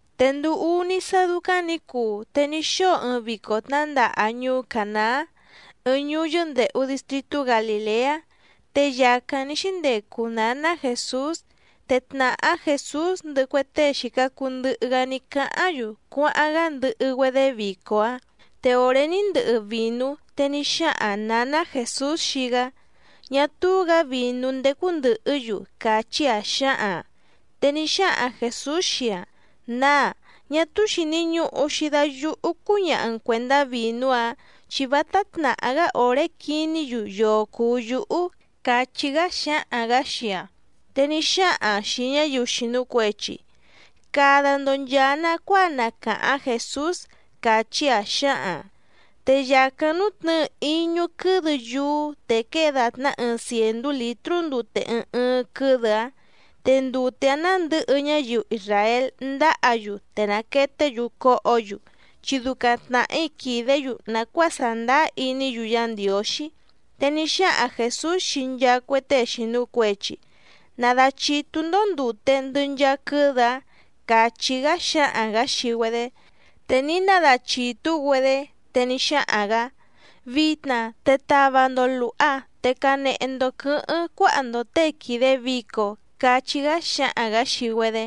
Te nduu úní sá dúcáⁿ nǐ cuu te ní xóo ɨɨⁿ vico tnǎndaha ñuú Cànaá, ɨɨⁿ ñuú yɨ́ndèhu distritú Galìleá. Te yàcáⁿ ní xíndecu nǎná Jèsús. Te tnàhá Jèsús ndɨhɨ cue tée xìca cuu ndɨhɨ‑gá ní cáháⁿ‑yu cuáháⁿ‑gá ndɨhɨ‑güedé vico‑áⁿ. Te òré ní ndɨhɨ vìnú, te ní xáhaⁿ nǎná Jèsús xii‑gá: —Ñá túú‑gǎ vìnú ndécú ndɨ̀hɨ́‑yu —càchí‑aⁿ xǎhaⁿ‑aⁿ. Te ní xáhaⁿ Jèsús xii‑aⁿ: —Nǎá, ñá túú xìni ñuhu‑xi da yúhú cúñaha‑n cuèndá vìnú‑áⁿ, chi vátá tnàhá‑gá òré quiní‑yu yoo cùu yúhú —càchí‑gá xáhaⁿ‑gǎ xii‑aⁿ. Te ní xáhaⁿ‑aⁿ xìi ñáyiu xìnu cuechi: —Cada‑ndo nchàa nacuáa na càháⁿ Jèsús —càchí‑aⁿ xǎhaⁿ‑aⁿ. Te yàcáⁿ nútnɨ̌ɨ íñú quɨ́dɨ yúú te quée dàtná ɨɨⁿ cièndú lǐtrú ndute ɨɨⁿ ɨɨⁿ quɨ́dɨ‑áⁿ. Te ndute‑áⁿ nándɨ̌hɨ ñáyiu isràél ndáhǎ‑yu te nàqueté‑yu cóhǒ‑yu chi ducaⁿ tnàhí quìdé‑yu nàcuáa sàndáá iní‑yu Yá Ndiǒxí. Te ní xáhaⁿ Jèsús xii nchaa cue tée xìnu cuechi: —Nadachìtú‑ndó ndùte ndɨ nchaa quɨ́dɨ‑áⁿ —càchí‑gá xáhaⁿ‑gǎ xii‑güedé. Te ní nadachìtú‑güedé. Te ní xáhaⁿ‑gǎ: —Vitna te tava‑ndo lùha, te canehe‑ndo quɨ̌hɨ́ⁿ cuáha‑ndo těe quìde vico —cachí‑gá xáhaⁿ‑gǎ xii‑güedé.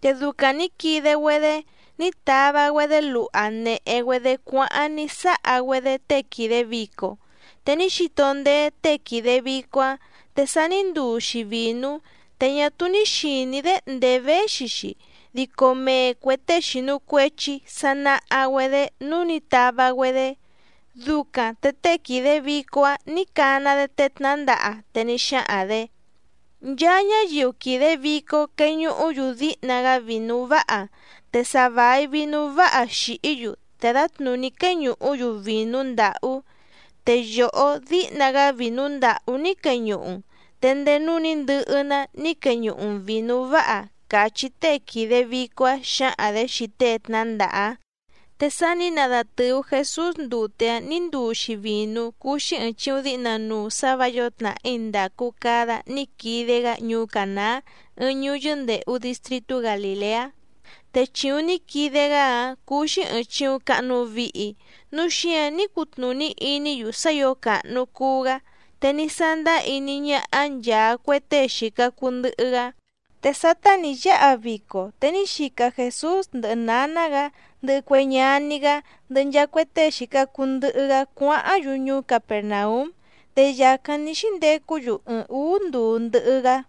Te ducaⁿ nǐ quide‑güedé ní tava‑güedé luha nèhe‑güedé cuáháⁿ ní sáha‑güedé tée quìde vico. Te ní xito ndéé tée quìde vico‑áⁿ, te sa ní nduu‑xi vìnú, te ñá túú ní xìní‑dé ndèé véxi‑xi, dico mee cuè tée xìnu cuechi sa naha‑güedé núú nǐ tava‑güedé. Ducaⁿ te tée quìde vico‑áⁿ nǐ cana‑dé tée tnǎndaha. Te ní xáhaⁿ‑dě: —Nchaa ñáyiu quìde vico queñuhú‑yu díhna‑gá vìnú váha. Te sa vài vinú váha xìhí‑yu, te dǎtnùní quéñùhú‑yu vìnú ndàhú. Te yòhó díhna‑gá vìnú ndàhú ní queñuhu‑n, te ndéé núú nǐ ndɨhɨ‑ná ní queñuhu‑n vìnú váha —càchí tée quìde vico‑áⁿ xǎhaⁿ‑dě xii tée tnǎndaha‑áⁿ. Te sá nǐ nadatɨ̀u Jesús ndute‑áⁿ nǐ nduu‑xi vìnú cúú‑xí ɨ̀ɨⁿ chiuⁿ díhna nuu sǎ vǎ yǒo tnàhí ndàcu cada ní quide‑gá ñuú Cànaá, ɨɨⁿ ñuú yɨ́ndèhu distritú Galìleá, te chìuⁿ ní quide‑gá‑áⁿ cúú‑xí ɨ̀ɨⁿ chiuⁿ cahnu vihi, núu xíǎⁿ ní cutnùní iní‑yu sá ǐo càhnu cuu‑gá, te ní sándáá iní ñáhá nchàa cue tée xìca cuu ndɨhɨ‑gá. Te sátá nǐ yáha vico, te ní xica Jèsús ndɨhɨ nǎná‑gǎ, ndɨhɨ cue ñaní‑gá, ndɨhɨ nchaa cue tée xìca cuu ndɨhɨ‑gá cuáháⁿ‑yu ñuú Capèrnaúm. Te yàcáⁿ ní xíndecú‑yu ɨɨⁿ ǔú nduu ndɨhɨ‑gá.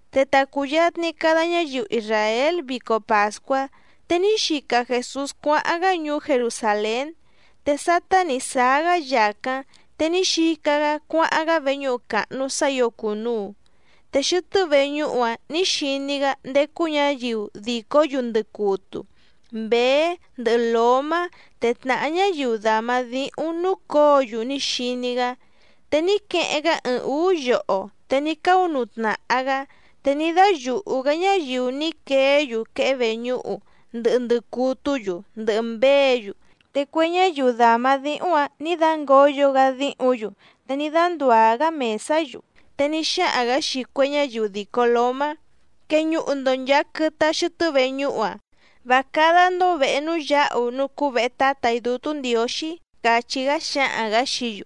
Te ta cùyatni cada ñáyiu isràél vico pàscuá, te ní xica Jèsús cuáháⁿ‑gá ñuú Jerusàlén. Te sátá nǐ sáá‑gá yàcáⁿ, te ní xica‑gá cuáháⁿ‑gá veñúhu càhnu sá ǐo cùnuu, te xɨtɨ́ veñúhu‑áⁿ nǐ xiní‑gá ndécú ñǎyiu dìcó‑yu ndɨcutu, mběé ndɨhɨ lǒmá, te tnàhá ñáyiu dàma díhúⁿ núcǒo‑yu ní xiní‑gá. Te ní queheⁿ‑gá ɨɨⁿ ǔú yoho, te ní cáunuu tnàha‑gá, te ní dáyùhu‑gá ñáyiu ní queé‑yu quehé veñúhu, ndɨhɨ ndɨcutú‑yu ndɨhɨ mběě‑yu. Te cue ñáyiu dàma díhúⁿ‑ǎⁿ ní dángǒyo‑gá díhǔⁿ‑yu, te ní dándùá‑gá mèsá‑yu. Te ní xáhaⁿ‑gǎ xii cue ñáyiu dìco lómá: —¡Queñuhu‑ndo nchàa quɨtɨ‑a xɨtɨ́ veñúhu‑a! ¡Vá cádá‑ndó vèhe núú yǎhu núú cúú vèhe Tátà‑í Dútú Ndiǒxí! —càchí‑gá xáhaⁿ‑gǎ xií‑yu.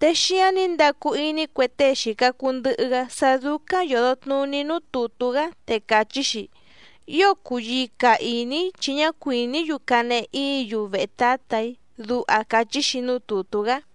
Te xíǎⁿ ní ndacu iní cue tée xìca cuu ndɨhɨ‑gá sá dúcáⁿ yòdo tnuní núú tùtú‑gá, te càchí‑xi: “Ío cùyica iní‑í chi ñá cuìní‑yu canehe íǐ‑yu vehe Tǎtà‑í”, duha càchí‑xi núú tùtú‑gá.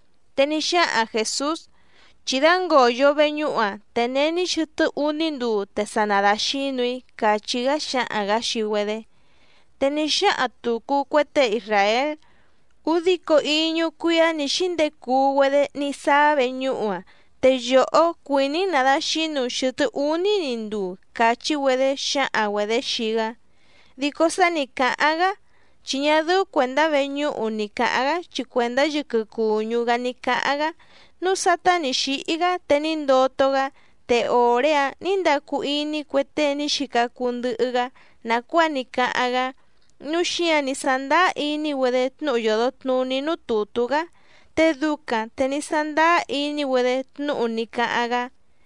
Te ní xáhaⁿ Jèsús: —Chí dángòyo veñúhu‑a, te není xɨtɨ́ úní nduu te sa nadàxínu‑í —càchí‑gá xáhaⁿ‑gǎ xii‑güedé. Te ní xáhaⁿ tùcu cue tée isràél: —Údico íñú cuíá nǐ xíndecuu‑güedé ní sáá veñúhu‑a, te yòhó cuìní‑n nàdaxínu‑n xɨ̀tɨ́ úní‑ni nduu —càchí‑güedé xǎhaⁿ‑güedě xii‑gá. Dico sá nǐ cáháⁿ‑gá chi ñá dɨ́ú cuèndá veñúhu ni cǎháⁿ‑gá chi cuèndá yɨquɨ cùñú‑gá ní cáháⁿ‑gá. Núu sátá nǐ xíhí‑gá, te ní ndoto‑gá, te òré‑áⁿ nǐ ndacu iní cue tée ní xica cuu ndɨhɨ‑gá nàcuáa ní cáháⁿ‑gá, núu xíǎⁿ ní sándáá iní‑güedé tnúhu yòdo tnuní núú tùtú‑gá. Te ducaⁿ te ní sándáá iní‑güedé tnúhu ní cáháⁿ‑gá.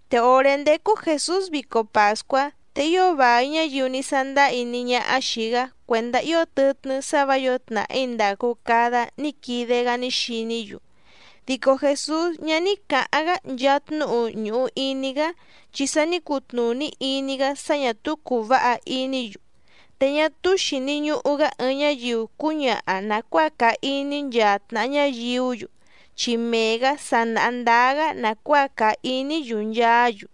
Te òré ndécú Jèsús vico pàscuá, te ío vài ñáyiu ní sándáá iní ñáhá xìi‑gá cuèndá ío tɨtnɨ́ sá vǎ yǒo tnàhí ndàcu cada ní quide‑gá ní xiní‑yu. Dico Jèsús ñá ní cǎháⁿ‑gá nchaa tnúhu ñùhu iní‑gá, chi sa ní cutnùní iní‑gá sá ñà túú cùu váha iní‑yu. Te ñá túú xìni ñuhu‑gá ɨɨⁿ ñáyiu cúñaha nàcuáa càa iní nchaa tnàha ñáyiú‑yu, chi mee‑gǎ sa nàha ndáá‑gá nàcuáa càa iní‑yu nchaá‑yu.